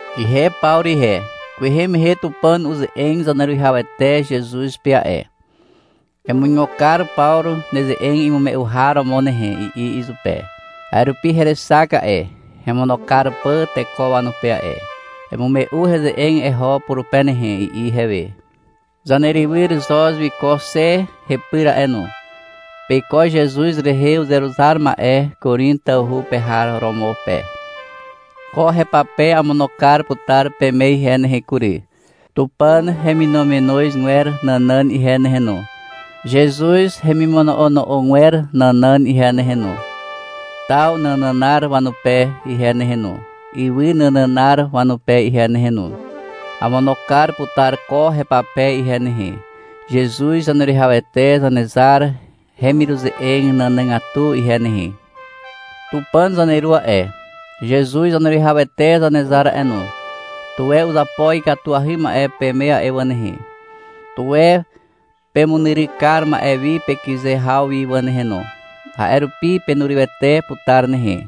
Ihe Pawru ihe. Kwehe mehe Tupàn uze'eg Zaneruwihawete Zezuz pe a'e. — Emuigo kar Pawru neze'eg imume'u har romo nehe, i'i izupe. A'e rupi herexak a'e, hemono kar pà teko wanupe a'e. — Emume'u heze'eg eho purupe nehe, i'i ihewe. Zanerywyr Xoz wiko xe hepyr a'e no. Peiko Zezuz rehe uzeruzar ma'e Korin tawhu pe har romo pe. Ko hepape amono kar putar peme ihe nehe kury, Tupàn heminominozgwer nànàn ihe nehe no, Zezuz hemimono'ono'ogwer nànàn ihe nehe no, taw nànànar wanupe ihe nehe no, ywy nànànar wanupe ihe nehe no. Amono kar putar ko hepape ihe nehe, Zezuz Zaneruwihawete Zanezar hemiruze'eg nànàgatu ihe nehe. Tupàn zaneru a'e, Zezuz Zaneruwihawete Zanezar a'e no, tuwe uzapo ikatuahy ma'e peme a'e wà nehe. Tuwe pemunyryk kar ma'e wi pekyze haw wi wà nehe no. A'e rupi penurywete putar nehe.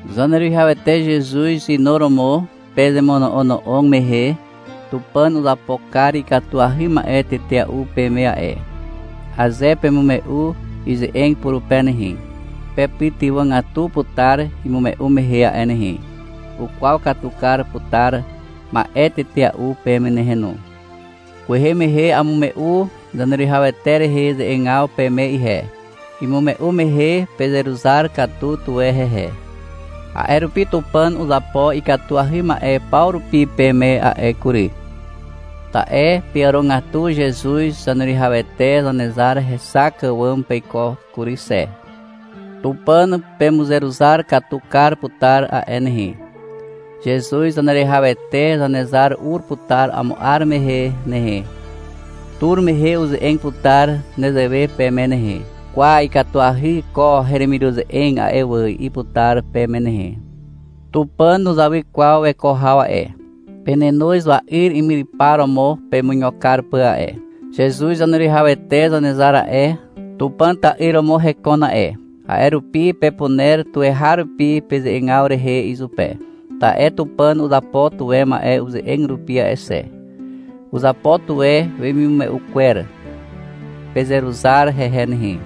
Zaneruwihawete Zezuz inuromo pezemono'ono'og mehe Tupàn uzapo kar ikatuahy ma'e tetea'u peme a'e. Aze pemume'u ize'eg purupe nehe, pepytywàgatu putar imume'u mehe a'e nehe. Ukwaw katu kar putar ma'e tetea'u peme nehe no. Kwehe mehe amume'u Zaneruwihawete rehe ze'egaw peme ihe. Imume'u mehe pezeruzar katu tuwe hehe. A'e rupi Tupàn uzapo ikatuahy ma'e paw rupi peme a'e kury. Ta'e peàrogatu Zezuz Zaneruwihawete Zanezar hexak àwàm peiko kury xe. Tupàn pemuzeruzar katu kar putar a'e nehe. Zezuz Zaneruwihawete Zanezar ur putar amo 'ar mehe nehe. Tur mehe uze'eg putar nezewe peme nehe, — Kwa, ikatuahy ko heremiruze'eg a'e wà, i'i putar peme nehe. Tupàn nuzawy kwaw weko haw a'e. Penenoz wa'yr imyrypar romo pemuigo kar pà a'e. Zezuz Zaneruwihawete Zanezar a'e, Tupàn ta'yr romo hekon a'e. A'e rupi pepuner tuweharupi peze'egaw rehe izupe. Ta'e Tupàn uzapo tuwe ma'e uze'eg rupi a'e xe. Uzapo tuwe wemimume'u kwer. Pezeruzar hehe nehe.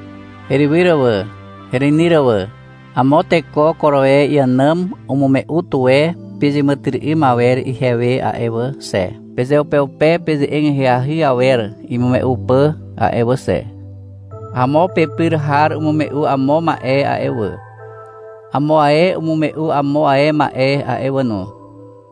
Herywyr wà, hereinyr wà, amo teko Koroe iànàm umume'u tuwe pezeàmàtyry'ym awer ihewe a'e wà xe, pezeupeupe peze'eg ahyahy awer imume'u pà a'e wà xe. Amo pepyr har umume'u amo ma'e a'e wà. Amo ae umume'u amo ae ma'e a'e wà no.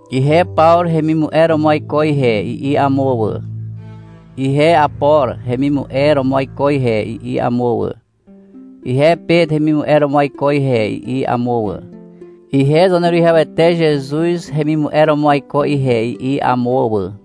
— Ihe Pawru hemimu'e romo aiko ihe, i'i amo wà. — Ihe Apor hemimu'e romo aiko ihe, i'i amo wà. — Ihe Pet hemimu'e romo aiko ihe, i'i amo wà. — Ihe Zaneruwihawete Zezuz hemimu'e romo aiko ihe, i'i amo wà.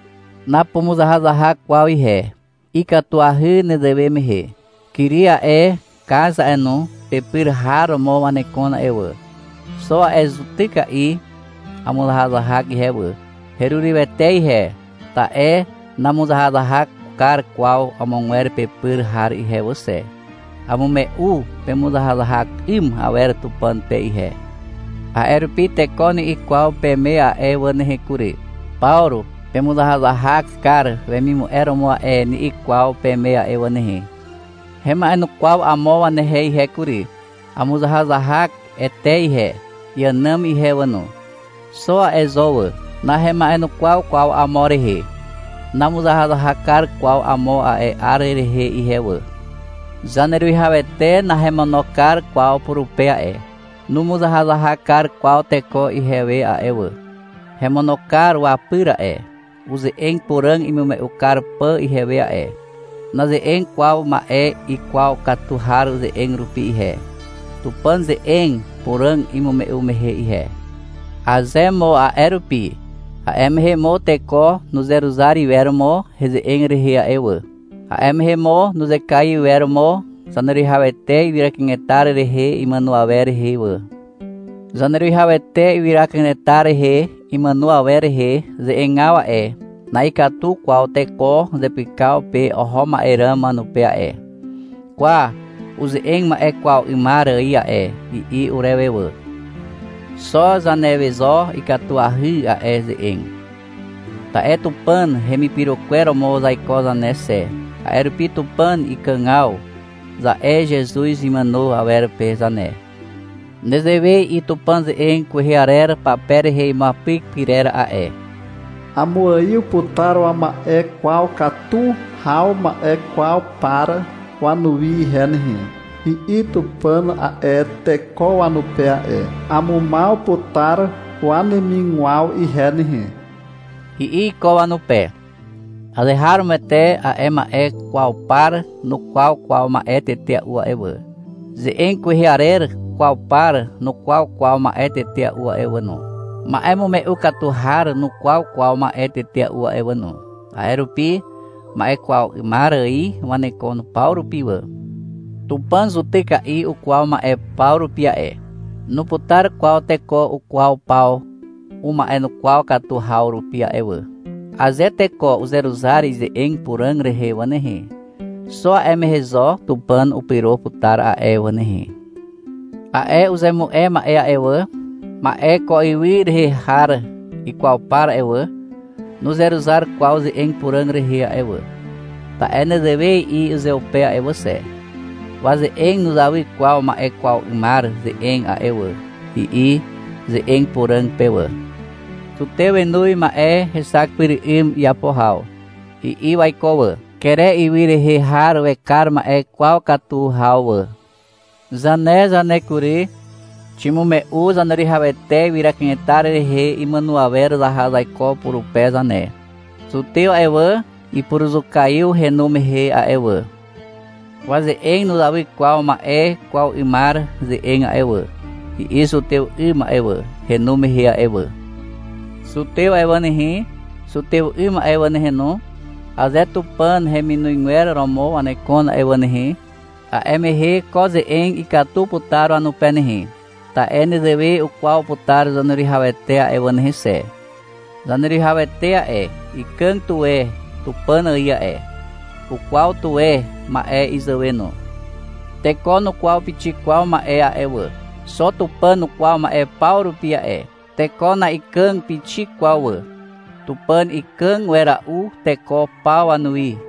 Napumuzahazahak kwaw ihe. Ikatuahy nezewe mehe. Kiri a'e, Kaz a'e no, pepyr har romo wanekon a'e wà. Xo a'e zutyka'i amuzahazahak ihe wà. Herurywete ihe, ta'e namuzahazahak kar kwaw amogwer pepyr har ihe wà xe. Amume'u pemuzahazahak 'ym awer Tupàn pe ihe. A'e rupi teko ni'i kwaw peme a'e wà nehe kury. — Pawru pemuzahazahak kar wemimu'e romo a'e, ni'i kwaw peme a'e wà nehe. Hema'enukwaw amo wanehe ihe kury. Amuzahazahak Ete ihe, iànàm ihe wà no. Xo a'e zo wà. Nahema'enukwaw kwaw amo rehe. Namuzahazahak kar kwaw amo a'e 'ar rehe ihe wà. Zaneruwihawete nahemono kar kwaw purupe a'e. Numuzahazahak kar kwaw teko ihewe a'e wà. Hemono kar wapyr a'e, uze'eg puràg imume'u kar pà ihewe a'e. Naze'eg kwaw ma'e ikwaw katu har ze'eg rupi ihe, Tupàn ze'eg puràg imume'u mehe ihe. Aze mo a'e rupi, a'e mehe mo teko nuzeruzar iwer mo heze'eg rehe a'e wà. A'e mehe mo nuzekaiw iwer mo Zaneruwihawete ywyra kanetar rehe imàno awer rehe wà. Zaneruwihawete ywyra kanetar rehe imàno awer rehe ze'egaw a'e, na'ikatu kwaw teko zepykaw pe oho ma'e ràm wanupe a'e. — Kwa, uze'eg ma'e kwaw 'ymar ài a'e, i'i urewe wà. Xo zanewe zo ikatuahy a'e ze'eg. Ta'e Tupàn hemipyro kwer romo zaiko zane xe, a'e rupi — Tupàn ikàgaw, za'e Zezuz imàno awer pe zane. Nezewe i'i Tupàn ze'eg kwehe arer pape rehe imuapyk pyrer a'e. — Amuaiw putar wama'e kwaw katu haw ma'e kwaw par wanuwi ihe nehe, i'i Tupàn a'e teko wanupe a'e. — Amumaw putar wanemigwaw ihe nehe, i'i iko wanupe. Azeharomoete a'e ma'e kwaw par nukwaw kwaw ma'e tetea'u a'e wà. Ze'eg kwehe arer kwaw par nukwaw kwaw ma'e tetea'u a'e wà no. Ma'emume'u katu har nukwaw kwaw ma'e tetea'u a'e wà no. A'e rupi ma'e kwaw 'ymar ài wanekon paw rupi wà. Tupàn zutyka'i ukwaw ma'e paw rupi a'e. Nuputar kwaw teko ukwaw paw uma'ekwaw katu haw rupi a'e wà. Aze teko uzeruzar ize'eg puràg rehe wà nehe, xo a'e mehe zo Tupàn upyro putar a'e wà nehe. A'e uzemu'e ma'e a'e wà, ma'e ko ywy rehe har ikwaw par a'e wà, nuzeruzar kwaw ze'eg puràg rehe a'e wà, ta'e nezewe i'i uzeupe a'e wà xe. — Waze'eg nuzawy kwaw ma'e kwaw 'ymar ze'eg a'e wà, i'i ze'eg puràg pe wà. Zutew wenoz ma'e hexak pyr 'ym iapo haw, i'i waiko wà. Kere ywy rehe har wekar ma'e kwaw katu haw wà. Zane zane kury. Ximume'u Zaneruwihawete ywyra kanetar rehe imàno awer zaha zaiko purupe zane. Zutew a'e wà, ipuruzukaiw henu mehe a'e wà. — Waze'eg nuzawy kwaw ma'e kwaw 'ymar ze'eg a'e wà, i'i zutew 'ym a'e wà, henu mehe a'e wà. Zutew a'e wà nehe, zutew 'ym a'e wà nehe no, aze Tupàn heminozgwer romo wanekon a'e wà nehe, a'e mehe ko ze'eg ikatu putar wanupe nehe. Ta'e nezewe ukwaw putar Zaneruwihawete a'e wà nehe xe. Zaneruwihawete a'e, ikàg tuwe Tupàn ài a'e. Ukwaw tuwe ma'e izàwe no. Teko nukwaw pixik kwaw ma'e a'e wà. Xo Tupàn ukwaw ma'e paw rupi a'e. Teko na'ikàg pixik kwaw wà. Tupàn ikàg wera'u teko paw wanuwi.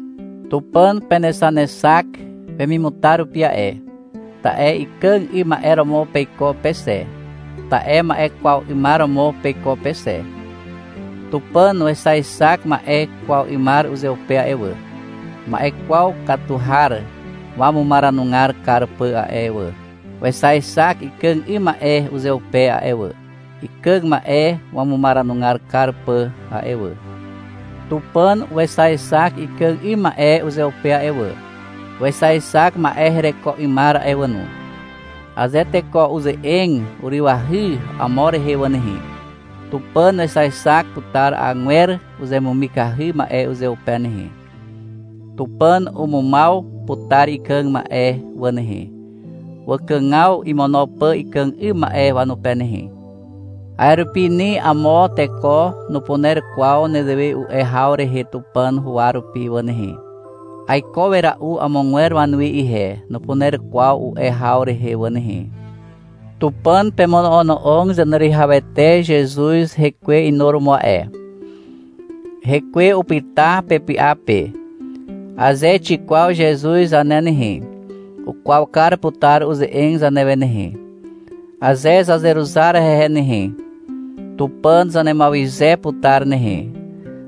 Tupàn penexanexak wemimutar rupi a'e, ta'e ikàg 'ym ma'e romo peiko pe xe. Ta'e ma'e kwaw 'ymar romo peiko pe xe. Tupàn wexaexak ma'e kwaw 'ymar uzeupe a'e wà, ma'e kwaw katu har wamumaranugar kar pà a'e wà. Wexaexak ikàg 'ym ma'e uzeupe a'e wà, ikàg ma'e wamumaranugar kar pà a'e wà. Tupàn wexaexak ikàg 'ym ma'e uzeupe a'e wà, wexaexak ma'e hereko 'ymar a'e wà no. Aze teko uze'eg urywahy amo rehe wà nehe, Tupàn wexaexak putar agwer uzemumikahy ma'e uzeupe nehe. Tupàn umumaw putar ikàg ma'e wà nehe, wakàgaw imono pà ikàg 'ym ma'e wanupe nehe. A'e rupi ni amo teko nupuner kwaw nezewe u'e haw rehe Tupàn huwa rupi wà nehe. — Aiko wera'u amogwer wanuwi ihe, nupuner kwaw u'e haw rehe wà nehe. Tupàn pemono'ono'og Zaneruwihawete Zezuz hekwe inuromo a'e. Hekwe upyta pepy'a pe. Aze xikwaw Zezuz zane nehe, ukwaw kar putar uze'eg zanewe nehe. Aze zazeruzar hehe nehe, Tupàn zanemuawyze putar nehe.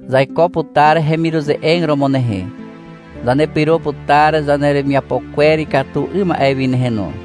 Zaiko putar hemiruze'eg romo nehe, zanepyro putar zaneremiapo kwer ikatu 'ym ma'e wi nehe no.